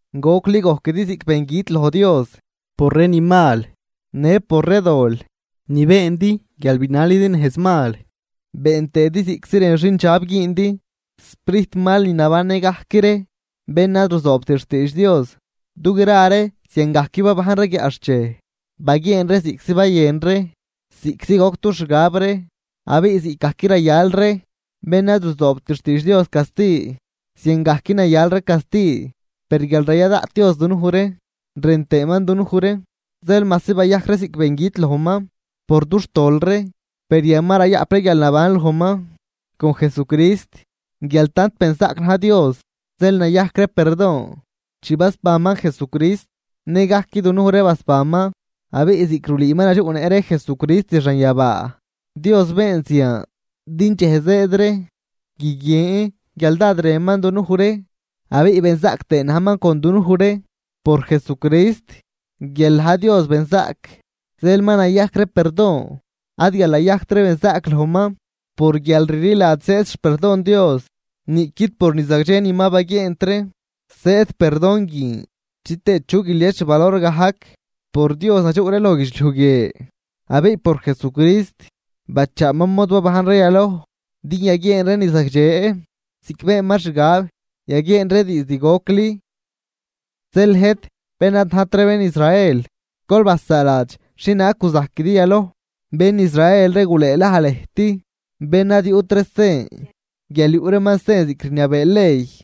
Gocli gojquidi ziꞌc bengüt loj Dios por ree ni mal në por ree dol ni beendi guial binalidi nejz mal been tëëdi ziꞌctzi rën xindxab güündi, sprijtmal ni nabannë gajc ree bén ad ruzoobt xtiidx Dios. Du gra ree ziangajc babajn ree guiaꞌxchej. Baguieen ree ziꞌctzi bayën ree, ziꞌctzi goc dux xgab ree, abiꞌ ziꞌcgajc rayal ree bén ad ruzoobt xtiidx Dios casti, ziangajc nayal ree casti. Per guial raya daꞌt Dios dunuj ree rën tëëman dunuj ree, zeel majsi bayajc ree ziꞌc bengüt lojman por dux tol ree, per yan ma rayaꞌp ree guialnaban lojman con Jesucrist. Guial tant benzaꞌc naj Dios, zeel nayajc ree perdon. Chi basbanman Jesucrist nëgajc dunuj ree basbanman abiꞌ ziꞌc rulüü ma nadxuꞌnëꞌ ree Jesucrist xanyabaa. Dios been zian din dxej zëëd ree guiguien guial dád rënman dunuj ree, abiꞌ benzaꞌc tëë najman con dunuj ree por Jesucrist. Guial na̱j Dios benzaꞌc, zeel ma nayajc ree perdon, ad guial nayajct ree benzaꞌc lojman. Por guial rliladx zëëd xperdon Dios. Niꞌquid por ni zagdxe ni ma baguieent ree zëëd perdon guin chitëë chu guilies xvalor gajc. Por Dios nadxuꞌ ree loj guidxliuj guie abiꞌ por Jesucrist bachaaman mod babajn ree yaloj din yaguieen ree ni zagdxe ziꞌc beenman xgab yaguieen ree diizd gocli. Zeel lëjt bén ad najt ree bén Israel, gol basaaladx xhienaag guzajquidi yaloj. Bén Israel ree gulëëlaj lëjt bén ad yuꞌt ree sen guial yuꞌ reeman sen ziꞌc rniabee ley.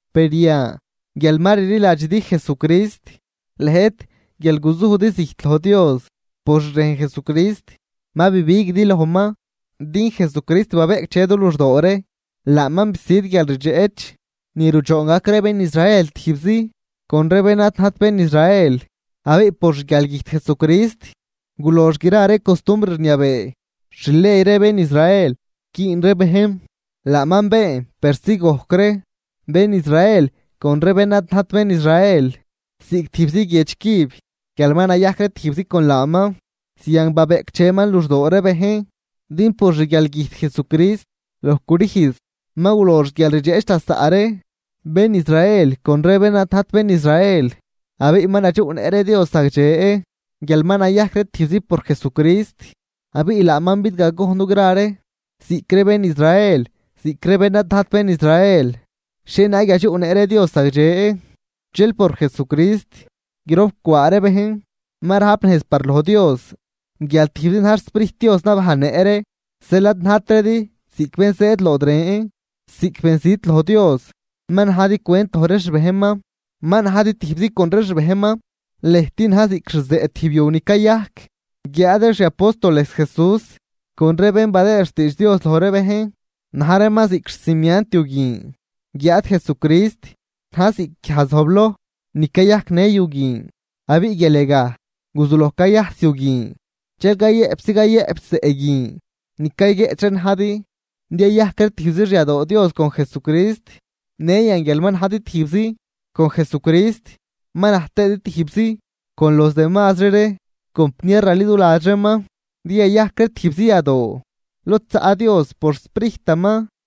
Per yan guial ma rliladxidi Jesucrist, lëjt guial guzujdi zijt loj Dios, por xrejn Jesucrist ma bibiguidi lojman. Din Jesucrist babeꞌcdxe du luxdoo ree. Laaman bisüd guialrdxeꞌch ni rudxoon gac ree bén Israel tijbzi con ree bén ad najt bén Israel. Abiꞌ por xguialgüjt Jesucrist gulox gra ree costumbr rniabee xley ree bén Israel güün ree bejn, laaman been persi gojc ree bén Israel con ree bén ad najt bén Israel ziꞌc tijbzi guiedx cüb guial ma nayajc ree tijbzi con laaman. Zian babeꞌcdxeman luxdoo ree bejn. Din por xguialgüjt Jesucrist loj crüjz ma gulox guialrdxeꞌch lasaꞌ ree bén Israel con ree bén ad najt bén Israel, abiꞌ ma nadxuꞌnëꞌ ree Dios zagdxe guial ma nayajc ree tijbzi por Jesucrist. Abiꞌ laaman bidgagojn dugra ree, ziꞌc ree bén Israel ziꞌc ree bén ad najt bén Israel xhienaag yadxuꞌnëꞌ ree Dios zagdxe. Dxel por Jesucrist grop cwaa ree bejn ma rajp nejz par loj Dios guial tijbzi na̱j xSprijt Dios nabajnnëꞌ ree. Zeel ad najtridi ziꞌc bén zëëd lod ren, ziꞌc benzit loj Dios, ma najdi cwent loj ree xbejnman, ma najdi tijbzi con ree xbejnman. Lëjt na̱j ziꞌc xzeꞌ tijb yu ni cayajc, guiáad ree xi apóstoles Jesús con ree bén badëë xtiidx Dios loj ree bejn, na̱j reeman ziꞌc xcimiant yu guin, guiáad Jesucrist na̱j ziꞌc guiaj zojbloj ni cayajcnë yu guin. Abiꞌ guial yagaj guzuloj cayajs yu guin, dxel cayëꞌpzi cayëꞌp zeꞌ guin ni cayguieꞌch ree najdi din yayajc ree tijbzi xyadoo Dios con Jesucrist. Në yan guial ma najdi tijbzi con Jesucrist ma na̱j tëëdi tijbzi con los demazri compniar raliduladx reeman din yayajc ree tijbzi yadoo lod zaꞌ Dios por xSprijtaman.